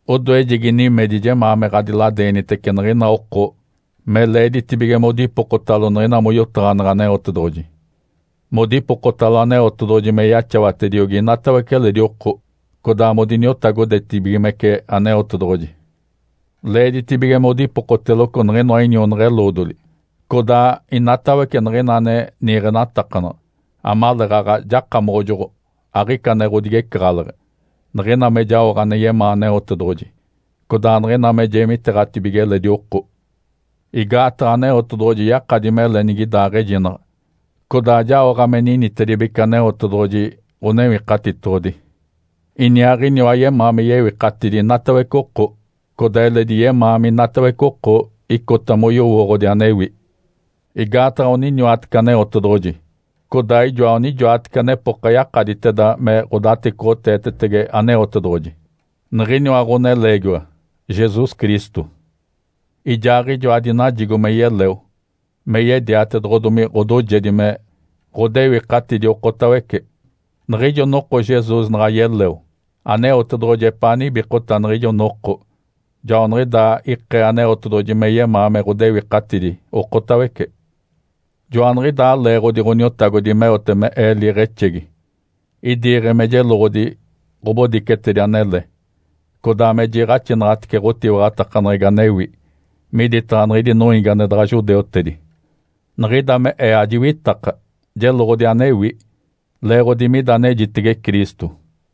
Odoejegi nimedi jemaa me ɡ̶adiladeenitece niɡ̶ina oko me leeditibige modipokotalo niɡ̶ina moyotaɡ̶aneɡ̶e Aneotedoɡ̶oji, modipokotalo Aneotedoɡ̶oji me yaxawatediogi inatawece eledi oko, codaa modiniotagodetibigimece Aneotedoɡ̶oji. Leeditibige modipokoteloco niɡ̶inoa inionaɡ̶a-eloodoli, codaa inatawece niɡ̶ina ane niiɡ̶enatakanaɡ̶a, amaleeɡ̶aɡ̶a jakamoɡ̶ojoɡ̶o, aɡ̶ica ane ɡ̶odigecaɡ̶aleɡ̶e, niɡ̶ina me jaoɡ̶a ane yemaa Aneotedoɡ̶oji, codaa niɡ̶ina me jeemiteeɡ̶atibige eledi oko. Igaataɡ̶a Aneotedoɡ̶oji yakadi mele nigidaaɡ̶ejinaɡ̶a, codaa jaoɡ̶a me ninitedibece Aneotedoɡ̶oji Ǥonewikatitoɡ̶odi. Iniaaɡ̶iniwa yemaa me yewikatidi inatawece oko. Codaa eledi yemaa minatawece oko icota moyowooɡ̶odi anewi. Igaataɡ̶a oniniwatece Aneotedoɡ̶oji, codaa ijoa onijoatece anepoka yakaditeda me ɡ̶odatecoɡ̶oteetetege Aneotedoɡ̶oji, niɡ̶iniwa Ǥoneleegiwa, Jesus Cristo. Ijaaɡ̶ijoa dinajigo me yeleo me yediatedoɡ̶odomi ɡ̶odoojedi me ɡ̶odewikatidi okotawece. Niɡ̶ijo noko Jesus naɡ̶a yeleo Aneotedoɡ̶oji epaa nibikota niɡ̶ijo noko, joaniɡ̶idaa ikee Aneotedoɡ̶oji me yemaa me ɡ̶odewikatidi okotawece. Joaniɡ̶idaa leeɡ̶odi Ǥoniotagodi meote me ee liiɡ̶exegi. Idiiɡ̶e me jeloɡ̶odi ɡ̶obodicetedi anele, codaa me jiiɡ̶axinaɡ̶atece ɡ̶otiwaɡ̶atakaneɡ̶egi anewi miditaɡ̶a niɡ̶idi noiigi ane daɡ̶a judeutedi. Niɡ̶ida me ee ajiwitaka, jeloɡ̶odi anewi, leeɡ̶odi mida anejitege Cristo.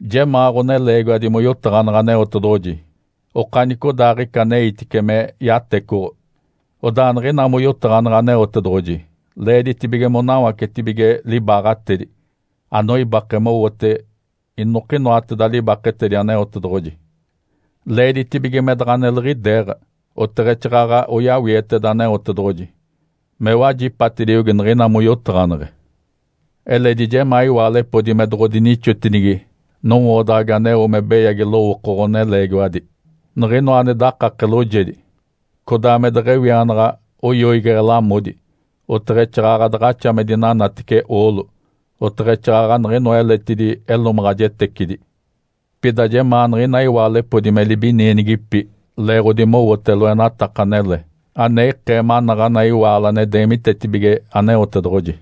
Jemaa ɡ̶oneleegiwadi moyotaɡ̶aneɡ̶e Aneotedoɡ̶oji okanicodaaɡ̶ica aneitice me yatecoɡ̶o. Odaa niɡ̶ina moyotaɡ̶aneɡ̶e Aneotedoɡ̶oji leeditibige monawacetibige libaaɡ̶atedi, anoibake mowote inokinoateda libaketedi Aneotedoɡ̶oji. Leeditibige me daɡ̶a neliɡ̶ideeɡ̶a, oteɡ̶exaaɡ̶aɡ̶a oyawieteda Aneotedoɡ̶oji me wajipatediogi niɡ̶ina moyotaɡ̶aneɡ̶e. Eledi jemaa iwaalepodi me doɡ̶odinixotinigi nowoodaɡ̶agi aneo me beyagi lowooko ɡ̶oneleegiwadi, niɡ̶inoa ane dakake loojedi, codaa me deɡ̶ewianaɡ̶a oyoigeɡ̶e lamodi, oteɡ̶exaaɡ̶aɡ̶a daɡ̶axa me dinanatece oolo, oteɡ̶exaaɡ̶aɡ̶a niɡ̶inoa eletidi elomaɡ̶ajetecidi. Pida jemaa niɡ̶ina iwaalepodi me libinienigipi leeɡ̶odi mowote loenataka anele, ane ikee manaɡ̶ana iwaalo ane deemitetibige Aneotedoɡ̶oji.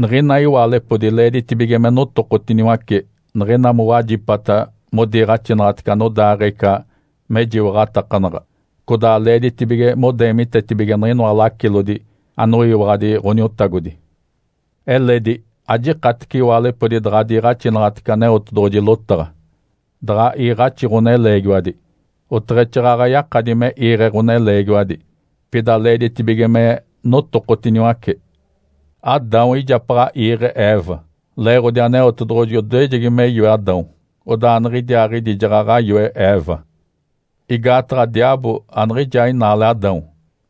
Niɡ̶ina iwaalepodi leeditibige me notokotiniwace niɡ̶ina mowajipata modiniiɡ̶axitece anodaaɡ̶ee ica mejiwaɡ̶atakanaɡ̶a, codaa leeditibige modeemitetibige niɡ̶inoa lacilodi anoyiwaɡ̶adi Ǥoniotagodi. Eledi ajikatece iwaalo daɡ̶a diiɡ̶axinaɡ̶atece Aneotedoɡ̶oji lotaɡ̶a, daɡ̶a iiɡ̶axi ɡ̶oneleegiwadi, oteɡ̶exaaɡ̶aɡ̶a yakadi me iiɡ̶e ɡ̶oneleegiwadi. Pida leeditibige me notokotiniwace. Adão ijapaɡ̶a iiɡ̶e Eva, leeɡ̶odi Aneotedoɡ̶oji odoejegi me yoe Adão, odaa niɡ̶idiaaɡ̶idi jaɡ̶aɡ̶a yoe Eva. Igaataɡ̶a diaabo aniɡ̶ijaa inaale Adão,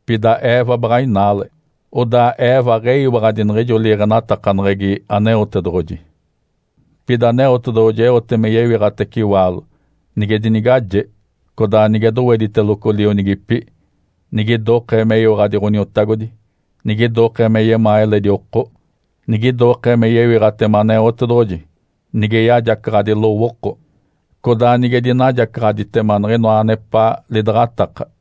pida Eva baɡ̶a inaale, odaa Eva aɡ̶eyiwaɡ̶adi niɡ̶ijo liiɡ̶enatakaneɡ̶egi Aneotedoɡ̶oji. Pida Aneotedoɡ̶oji eote me yewiɡ̶atace iwaalo, nige dinigaje, codaa nige dowediteloco lionigipi, nigidokee meyiwaɡ̶adi Ǥoniotagodi, nigidokee me yemaa eledi oko, nigidokee me yewiɡ̶atema Aneotedoɡ̶oji, nige yajacaɡ̶adi lowooko, codaa nige dinajacaɡ̶aditema niɡ̶inoa anepaa lidaɡ̶ataka.